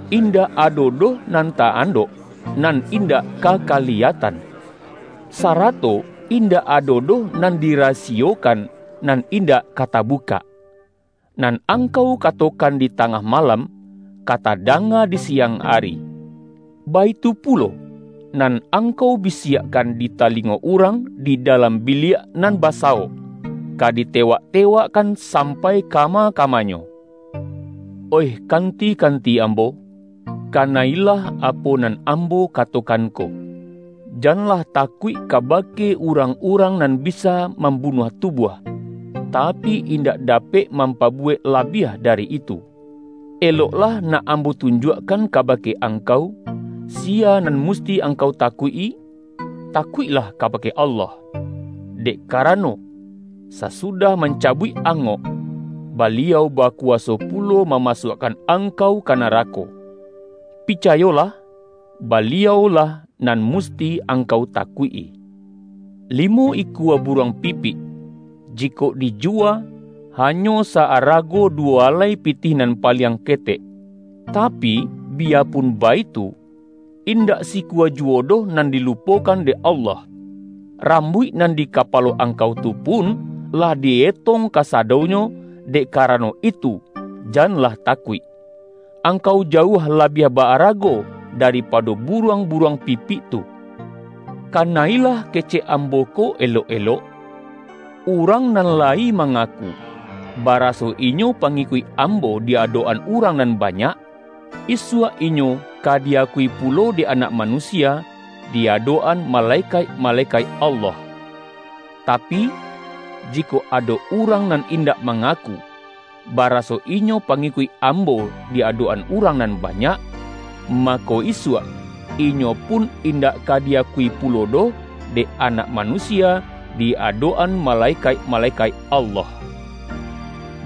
Indak ado doh nan ta-andok, nan indak ka kaliyatan, sa-rato indak ado doh nan dirasiyokan, nan indak ka tabukak. Nan angkau katokan di tangah malam, ka tadanga di siang ari; baitu pulo, nan angkau bi-siakkan di talingo urang di dalam bi-liak nan basawok, ka ditewak-tewak-kan sampai kama-kamanyo.” ”Oih kanti-kanti Ambo, kana-ilah apo nan Ambo katokan ko! Janlah takuik kabake urang-urang nan bi-sa mambunuah tubuah, tapi, indak dapek mampabuwek labiah dari itu. Eloklah nak Ambo tunjuakkan kaba-ke angkau, siya nan musti angkau ta-kuik-i. Takuiklah kabake Allah! Dek karano, sasudah mancabuik angok, Baliau bakuwaso pulo mamasuakkan angkau ka narako! Picayolah, Baliau-lah nan musti angkau takuik-i. Limo ikua buruang pipik, jikok di-juwa, hanyo sa-arago duwo alai pi-tih nan paliang ketek. Tapi, biyapun baitu, indak sikua juwo doh nan dilu-pokan dek Allah. Rambuik nan di ka-palo angkau tu pun, lah di-etong kasa-donyo, dek karano itu, janlah takuik; angkau jauah labiah ba-arago daripa-do buruang-buruang pipik tu!” ”Kana-ilah kecek Ambo ko elok-elok: Urang nan layi mangaku, baraso inyo pangikuik Ambo di adok-an urang nan hanyak, isuak inyo ka di-akui pu-lo dek Anak Manusia, di adok-an ma-lekaik-malekaik Allah. Tapi, jikok ado urang nan indak mangaku, baraso inyo pangikuik Ambo di adok-an urang nan banyak, mako, isuak, inyo pun indak ka di-akui pulo doh dek Anak Manusia di adok-an malekaik-malekaik Allah.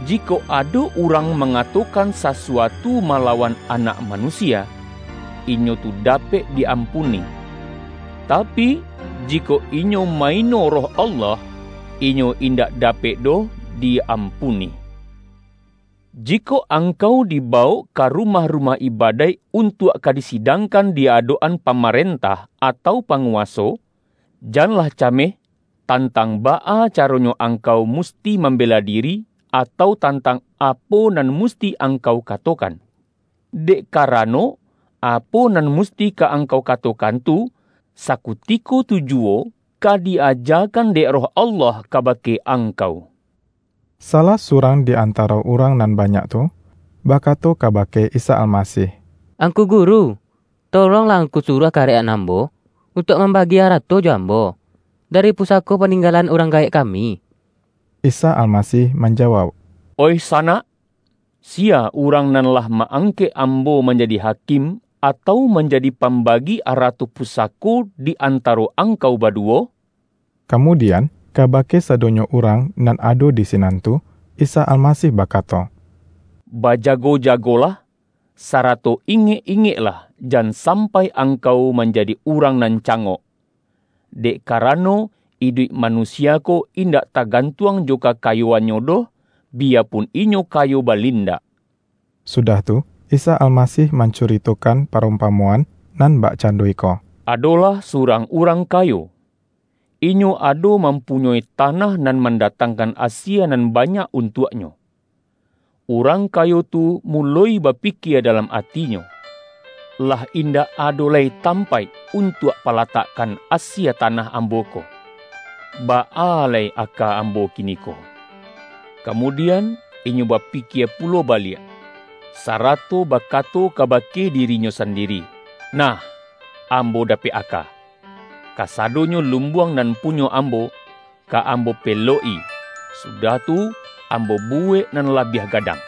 Jikok ado urang mangatokan sa-suatu malawan Anak Manusia, inyo tu dapek di-ampuni; tapi, jikok inyo ma-ino Roh Allah, inyo indak dapek doh di-ampuni. Jikok angkau dibawok ka rumah-rumah ibadaik, untuak ka disidang-kan di adok-an pamarentah, atau pa-nguwaso, janlah cameh, tantang baa caronyo angkau musti mambela diri, atau tantang apo nan musti angkau katokan. Dek karano, apo nan mus-ti ka angkau katokan tu, sakutiko tu juwo ka di-ajakan dek Roh Allah ka-bake angkau.” Salah surang di antaro urang nan banyak tu, bakato kabake Isa Almasih,”Angku Guru, tolonglah Angku suruah karek-an ambo, untuak mambagi ara-to jo ambo, dari pusako paninggalan urang gaek kami.” Isa Almasih manjawauk,”Oih sanak, siya urang nan lah ma-angkek Ambo manjadi hakim, atau manjadi pambagi arato pusako di antaro angkau baduwo?” Kamudian, kabake sadonyo urang nan ado di sinan tu, Isa Almasih bakato,”Ba-jago-jagolah, sarato ingek-ingeklah, jan sampai angkau manjadi urang nan ca-ngok. Dek karano, iduik manusia ko in-dak tagantuang jo kakayoannyo doh, bi-yapun inyo kayo balindak.” Sudah tu, Isa Almasih mancurito-kan parumpamoan, nan bakcando iko,”Adolah surang urang kayo. Inyo ado mampunyoi tanah nan mandatangkan asie nan banyak untuaknyo. Urang kayo tu muloi bapikie dalam atinyo, ’Lah indak ado lai tampaik untuak pala-takkan asie tanah ambo ko. Baa lai aka ambo kiniko?' Kamudian, inyo bapi-kie pulo baliak, sarato bakato kabake dirinyo sandiri, ’Nah, ambo dapek aka; kasadonyo lumbuang nan punyo ambo, ka ambo pa-elok-i, sudah tu, ambo bu-wek nan labiah gadang.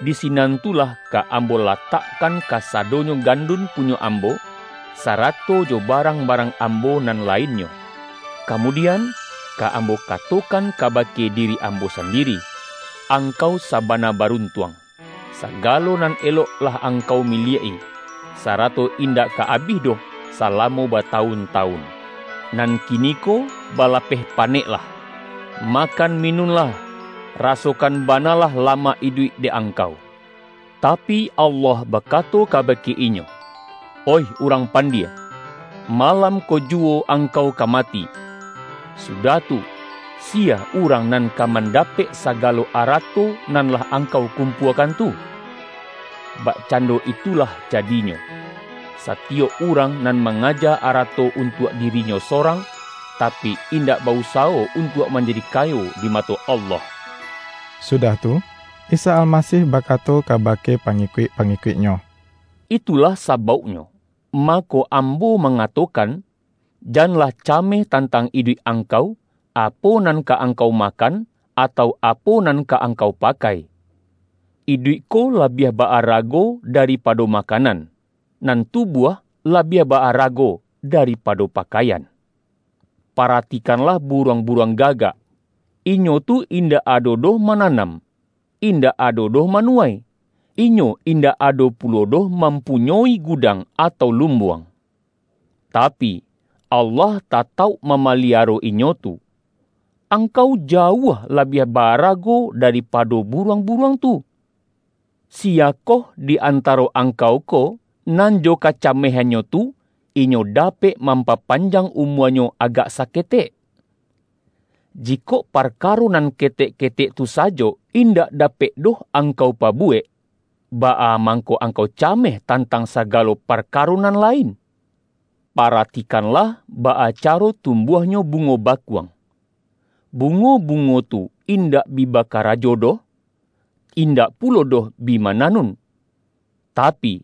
Di sinan tu lah ka ambo latakkan kasadonyo gandun punyo ambo, sarato jo barang-barang ambo nan lainnyo. Kamudian, ka am bo katokan kabake diri ambo sandiri: Angkau sabana baruntuang! Sagalo nan elok lah angkau milik-i, sarato indak ka abih doh salamo batawun-tawun. Nan kiniko balapeh paneklah! Makan mi-nunlah, rasokan banalah lamak iduik dek angkau!' Tapi, Allah bakato ka-bake inyo, ’Oih urang pandie! Malam ko juwo angkau ka mati, sudah tu, siya urang nan ka mandapek sagalo arato nan lah angkau kumpuakan tu?' Bakcando itulah jadinyo, satiyok urang nan mangaja arato untuak diri-nyo sorang, tapi, indak ba-usawo un-tuak manjadi kayo di mato Allah.” Sudah tu Isa Almasih bakato ka-bake pangikuik-pangikuik-Nyo,”Itulah sabauknyo, mako Ambo mangatokan, ’Janlah cameh tantang iduik angkau, apo nan ka angkau makan, atau apo nan ka angkau pakai.’ Iduik ko la-biah ba-arago daripado makanan, nan tubuah labiah ba-arago daripado pa-kaian. Paratikanlah buruang-bu-ruang gagak! Inyo tu indak ado doh mananam, indak ado doh manuwai, inyo indak ado pulo doh mampunyoi gudang, atau lumbuang. Tapi, Allah tatauk mamaliaro inyo tu! Angkau jauah labiah ba-arago daripado bu-ruang-buruang tu! Siyakoh di anta-ro angkau ko, nan jo kacamehannyo tu, inyo dapek mampapanjang umua-nyo agak saketek? Jikok parkaro nan ketek-ketek tu sajo, indak dapek doh angkau pabuwek, baa mangko angkau cameh tantang sagalo parka-ro nan lain? Paratikanlah baa caro tumbuahnyo bungo bakuang; bungo-bungo tu indak bi bakarajo doh, indak pulo doh bi mananun. Tapi,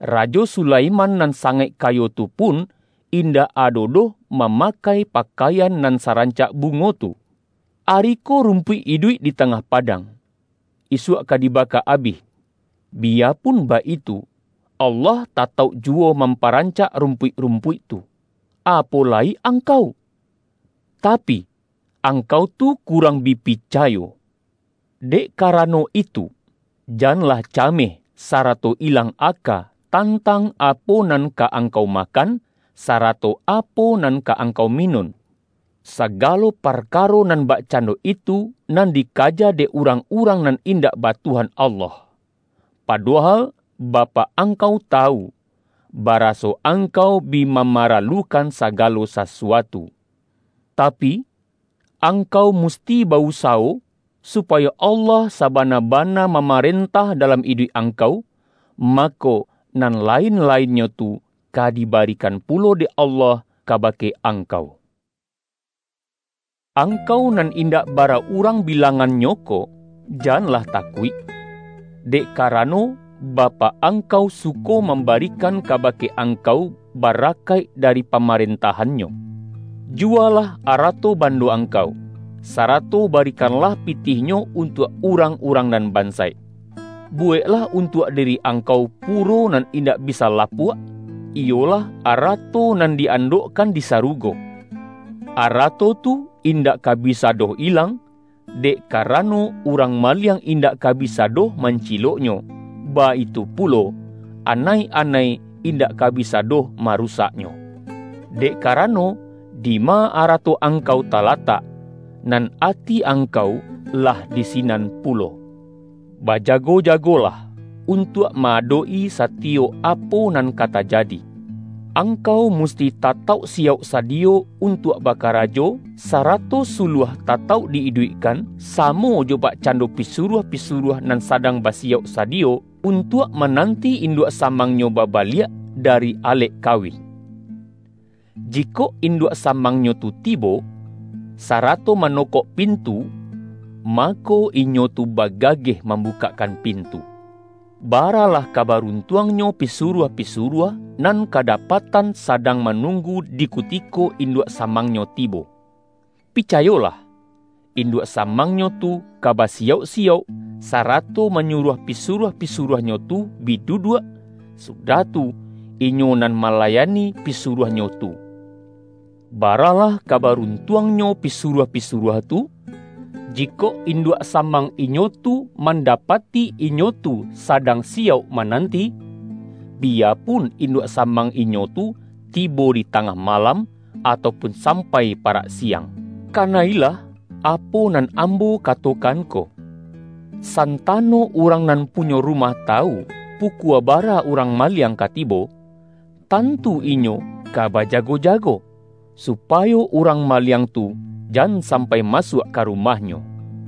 Rajo Su-laiman nan sangaik kayo tu pun, in-dak ado doh mamakai pakaian nan sarancak bungo tu! Ari ko rumpuik iduik di tangah padang, isuak ka diba-ka abih. Biyapun baitu, Allah tatauk juwo mamparancak rumpuik-rumpuik tu. Apo lai angkau! Tapi, angkau tu kurang bi picayo! Dek karano itu, janlah cameh, sarato ilang aka, tan-tang apo nan ka angkau makan, sa-rato apo nan ka angkau minun. Sa-galo parkaro nan bakcando itu, nan dikaja dek urang-urang nan indak ba Tuhan Allah. Padohal Bapak angkau tawu, baraso angkau bi mamaralukan sagalo sasuatu. Tapi, angkau musti ba-usawo, supayo Allah sabana-bana mamarentah dalam iduik angkau, ma-ko, nan lain-lainnyo tu ka dibarikan pulo dek Allah kabake angkau.” ”Angkau nan indak bara urang bi-langannyo ko, janlah takuik! Dek ka-rano, Bapak angkau suko mambarikan kabake angkau barakaik dari Pama-rentahan-Nyo. Juwalah arato ban-do angkau, sarato barikanlah pitihnyo untuak urang-urang nan bansaik. Bu-weklah untuak diri angkau puro nan indak bisa lapuak, iyolah arato nan di-andokkan di sarugo. Arato tu indak ka bisa doh ilang, dek karano, urang maliang indak ka bisa doh mancilok-nyo, baitu pulo, anai-anai indak ka bisa doh marusaknyo. Dek kara-no, dima arato angkau talatak, nan ati angkau lah di sinan pulo!” ”Bajago-jagolah untuak ma-adok-i satiyok apo nan ka tajadi. Angkau musti tatauk siyauk sadiyo untuak bakarajo, sarato suluah tatauk di iduikkan, samo jo bakcando pisuruah-pisuruah nan sadang basiyauk sadiyo, untuak ma-nanti induak samangnyo babaliak da-ri alek kawin. Jikok induak samangnyo tu tibo, sarato manokok pintu, mako, inyo tu bagageh mambukakkan pintu. Baralah ka baruntuangnyo pisuruah-pisuruah, nan kadapatan sadang ma-nunggu di kutiko induak samangnyo ti-bo. Picayolah: induak samangnyo tu ka basiyauk-siyauk, sarato manyuruah pi-suruah-pisuruahnyo tu bi duduak, su-dah tu, inyo nan malayani pisuruah-nyo tu. Baralah ka baruntuangnyo pisuruah-pisuruah tu, jikok induak sa-mang inyo tu mandapati inyo tu sa-dang siyauk mananti, biyapun induak samang inyo tu tibo di tangah malam, atau pun sampai parak siang! Kana-ilah apo nan Ambo katokan ko! Santa-no urang nan punyo rumah tawu, pu-kua bara urang maliang ka tibo, tantu inyo ka bajago-jago, supayo urang ma-liang tu jan sampai masuak ka rumah-nyo.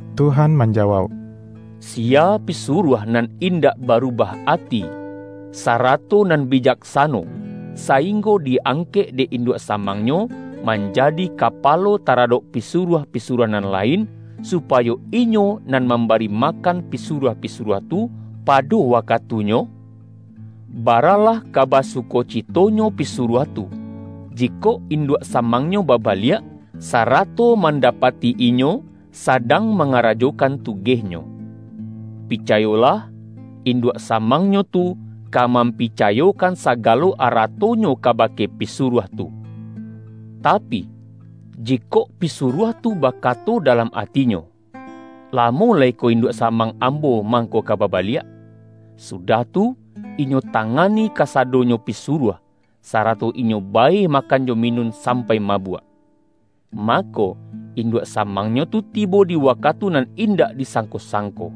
Tuhan manjawauk,”Siya pisuruah nan indak barubah ati, sarato nan bi-jaksano, sainggo di-angkek dek in-duak samangnyo, manjadi kapalo ta-radok pisuruah-pisuruah nan lain, supayo inyo nan mambari makan pi-suruah-pisuruah tu, pado wakatunyo? Baralah ka basukocitonyo pisuruah tu, jikok induak samangnyo babaliak, sarato mandapati inyo sadang manga-rajokan tugehnyo! Picayolah: Induak samangnyo tu ka mampicayokan sagalo aratonyo kabake pisuruah tu. Tapi, jikok pisuruah tu bakato dalam ati-nyo, ’Lamo lai ko induak samang am-bo mangko ka babaliak,' sudah tu, inyo tangani kasadonyo pisuruah, sarato inyo bae makan jo minun sampai ma-buak. Mako, induak samangnyo tu tibo di wakatu nan indak disangko-sangko.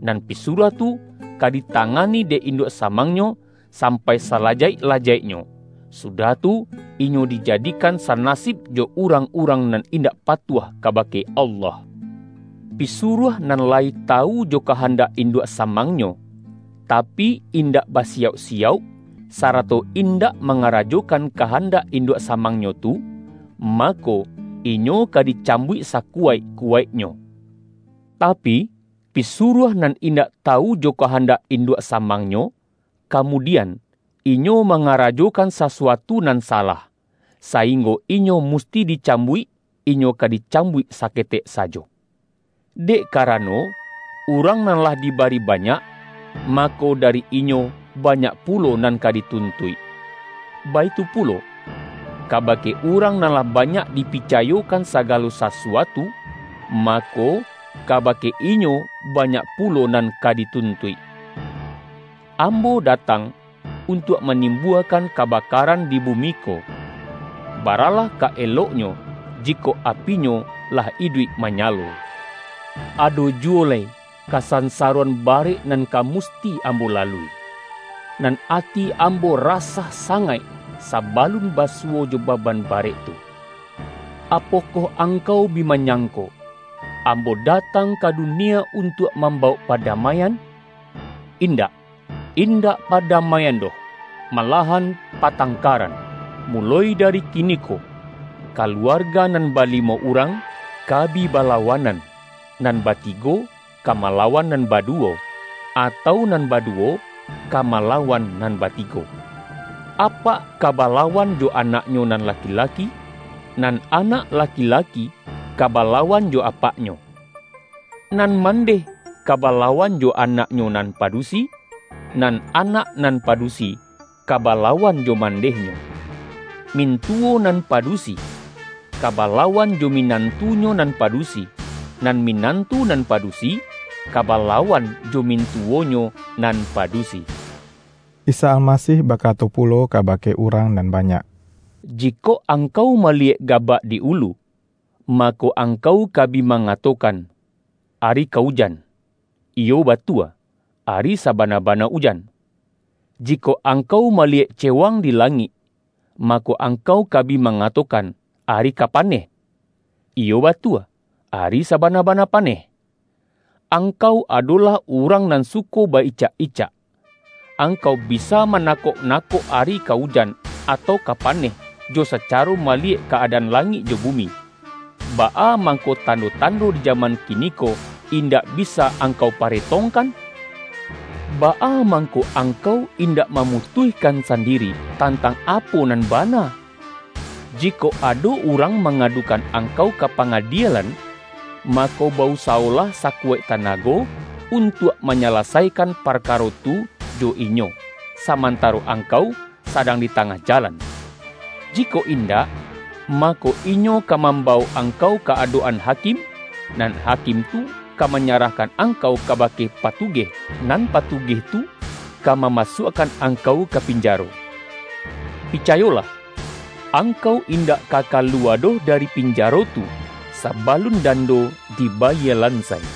Nan pisuruah tu ka ditangani dek induak samangnyo, sampai sala-jaik-lajaiknyo, sudah tu, inyo dijadi-kan sanasib jo urang-urang nan indak patuah kabake Allah. Pisuruah nan layi tawu jo kahan-dak induak samangnyo, tapi, indak ba-siyauk-siyauk, sarato indak mangara-jokan kahandak induak samangnyo tu, mako, inyo ka dicambuik sakuwaik-ku-waiknyo. Tapi, pisuruah nan indak tawu jo kahandak induak samangnyo, kamudian, inyo mangarajokan sasu-atu nan salah, sainggo inyo musti di-cambuik, inyo ka dicambuik saketek sajo. Dek karano, urang nan lah diba-ri banyak, mako, dari inyo banyak pu-lo nan ka dituntuik. Baitu pulo, kaba-ke urang nan lah banyak dipicayokan sagalo sasuatu, mako, kabake inyo ba-nyak pulo nan ka dituntuik.” ”Ambo datang untuak manimbua-kan kabakaran di bumi ko. Baralah ka eloknyo jikok apinyo lah iduik manya-lo! Ado juwo lai kasansaroan barek nan ka musti Ambo lalui. Nan ati Am-bo rasah sangaik sabalun basuwo jo baban barek tu. Apokoh angkau bi manyangko, Ambo datang ka dunia untuak mambawok padamaian? In-dak, indak padamaian doh, malahan patangkaran. Muloi dari kiniko, ka-luarga nan balimo urang, ka bi bala-wanan, nan batigo ka malawan nan baduwo, atau nan baduwo ka mala-wan nan batigo. Apak ka balawan jo anaknyo nan laki-laki, nan anak laki-laki ka balawan jo apaknyo. Nan man-deh ka balawan jo anaknyo nan padu-si, nan anak nan padusi ka balawan jo mandehnyo. Mintuwo nan padusi ka balawan jo minantunyo nan padusi, nan minantu nan padusi ka balawan jo mintuwonyo nan padusi.” Isa Almasih bakato pulo kaba-ke urang nan banyak,”Jikok angkau maliyek gabak di ulu, mako, angkau ka bi mangatokan, ’Ari ka ujan.’ Iyo, batua, ari sabana-bana ujan. Jikok angkau maliyek cewang di langik, ma-ko, angkau ka bi mangatokan, ’Ari ka paneh.’ Iyo, batua, ari sabana-bana paneh. Angkau adolah urang nan suko baicak-icak! Angkau bisa mana-kok-nakok, ari ka ujan, atau ka paneh, jo sacaro maliyek ka-adaan langik jo bumi. Baa mangko tando-tando di ja-man kiniko indak bisa angkau pare-tongkan?” ”Baa mangko angkau indak ma-mutuihkan sandiri, tantang apo nan bana? Jikok ado urang mangadu-kan angkau ka pangadielan, mako, ba-usawolah sakuwaik tanago, untuak manyalasaikan parkaro tu jo inyo, sa-mantaro angkau sadang di tangah ja-lan. Jikok indak, mako inyo ka mam-bawok angkau ka adok-an hakim, nan hakim tu ka manyarahkan angkau kabake patugeh, nan patugeh tu ka mamasuakkan angkau ka pinjaro. Picayolah! Angkau indak ka kalu-wa doh dari pinjaro tu, sabalun dan-do dibayie lansai.”